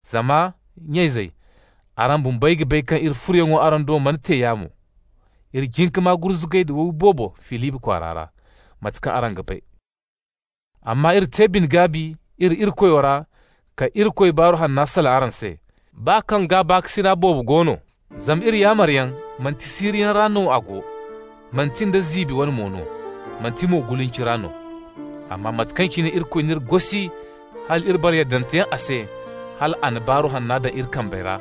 Zama, nya-izey, araŋ bumbey ga bay kaŋ iri furoyaŋ araŋ do mana te yaamo. Iri jin ka maa gurzugay da wowi boobo Filibi kwaara ra, mate kaŋ araŋ ga bay. Amma iri te bine-gaabi iri Irikoyo ra ka Irikoy Baaru Hanna salaŋ araŋ se, baa kaŋ gaabakasina boobo go no. Zama iri yaamaryaŋ, manti siiriyaŋ ra no a go, manti nda ziibi wane mo no, manti mo gulinci ra no. Amma mate kaŋ cine Irikoy n'iri gosi hal iri bara yaddante yaŋ a se, hal a na Baaru Hanna daŋ iri kambe ra,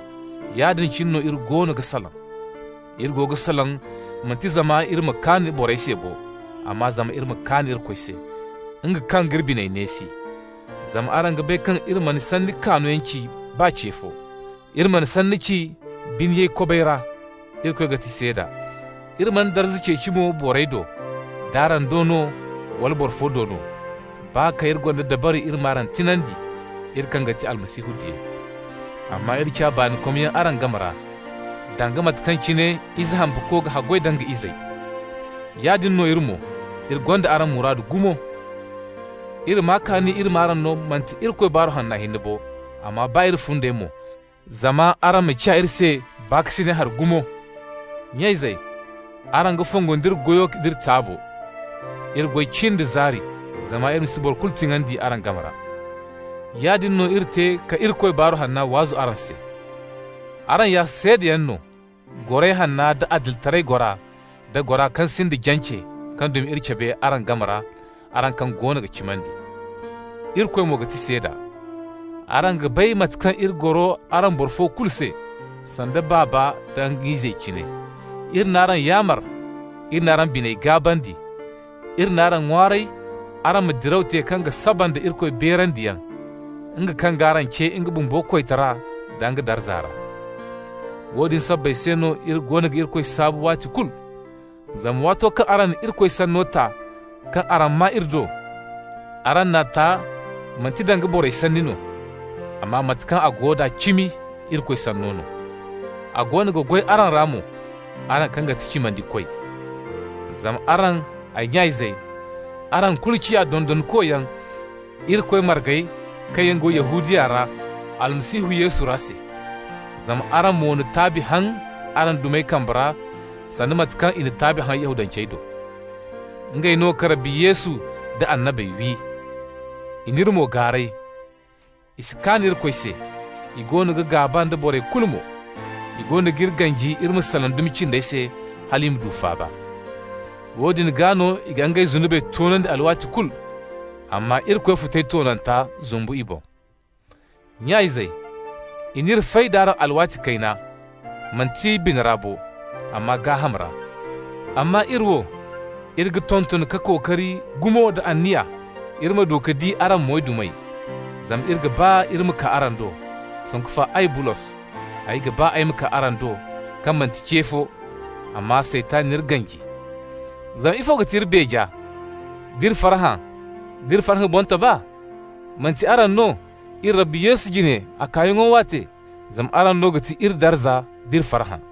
yaadin cine no iri goono ga salaŋ. Iri go ga salaŋ manti zama iri ma kaan borey se bo, amma zama iri ma kaan Irikoy se, nga kaŋ g'iri biney neesi. Zama araŋ ga bay kaŋ iri mana sanni kaanoyaŋ ci baa ce fo. Iri mana sanni ci biniyay kobay ra, (Irikoy no ga ti seeda). Iri mana darza ceeci mo borey do, d'araŋ do no wala boro fo do no, baa kaŋ iri gonda dabari iri m'araŋ tiŋandi, iri kaŋ ga ti Almasihu diyey. Amma iri ciya baanikomyaŋ araŋ game ra, danga mate kaŋ cine ize hampako ga haggoy da nga izey. Yaadin no iri mo, iri gonda araŋ muraadu gumo. Iri maa kaani iri m'araŋ no, manti Irikoy Baaru Hanna hinne bo, amma baa iri fundey mo, zama araŋ ciya iri se baakasinay hari gumo. Nya-izey, araŋ ga fongu nda iri goyo d'iri taabo. Iri goy cin da zaari zama iri ma si boro kulu tiŋandi araŋ game ra. Yaadin no iri te ka Irikoy Baaru Hanna waazu araŋ se. Araŋ ya seedayaŋ no, goray hanna, da adilitaray gora, da gora kaŋ sinda jance kaŋ dumi iri cabe araŋ game ra, araŋ kaŋ goono ga cimandi. Irikoy mo ga ti seeda. Araŋ ga bay mate kaŋ iri goro araŋ boro fo kulu se, sanda baaba nda nga izey cine. Iri n'araŋ yaamar, iri n'araŋ bine gaabandi, iri n'araŋ ŋwaaray araŋ ma diraw te kaŋ ga saba nda Irikoy beerandiyaŋ, nga kaŋ g'araŋ ce nga bumbo koytara nda nga darza ra. Woodin sabbay se no iri goono ga Irikoy saabu waati kulu, zama waato kaŋ araŋ na Irikoy Sanno ta kaŋ araŋ maa iri do, araŋ n'a ta manti danga borey sanni no, amma mate kaŋ a go da cimi, Irikoy Sanno no. A goono ga goy araŋ ra mo, araŋ kaŋ ga ti cimandikoy. Zama araŋ, ay nya-izey, araŋ kulu ciya dondonkoyaŋ Irikoy margey kaŋ yaŋ go Yahudiya ra Almasihu Yesu ra se. Zama araŋ mo na taabi haŋ araŋ dumey kambe ra sanda mate kaŋ i na taabi haŋ Yahudancey do. Ngey no ka Rabbi Yesu nda annabey wi. I n'iri mo gaaray. I si kaan Irikoy se, i goono ga gaaba nda borey kulu mo. I goono g'iri ganji iri ma salaŋ dumi cindey se hal i ma du faaba. Woodin gaa no i ga ngey zunubey toonandi alwaati kulu. Amma Irikoy futay toonanta zumbu i boŋ. Nya-izey, i n'iri fay d'araŋ alwaati kayna, manti bina ra bo, amma gaaham ra. Amma iri wo, iri ga tonton ka kookari gumo da anniya, iri ma du ka di araŋ moydumey. Zama iri ga ba iri ma kaa araŋ do, sanku fa ay Bulos, ay ba ay ma kaa araŋ do kaŋ manti ce fo, amma Saytan n'iri ganji. Zama ifo ga ti iri beeja, d'iri farhã, d'iri farhã boŋtoba? Manti araŋ no, iri Rabbi Yesu jine a kaayaŋo waate? Zama araŋ no ga ti iri darza d'iri farhã.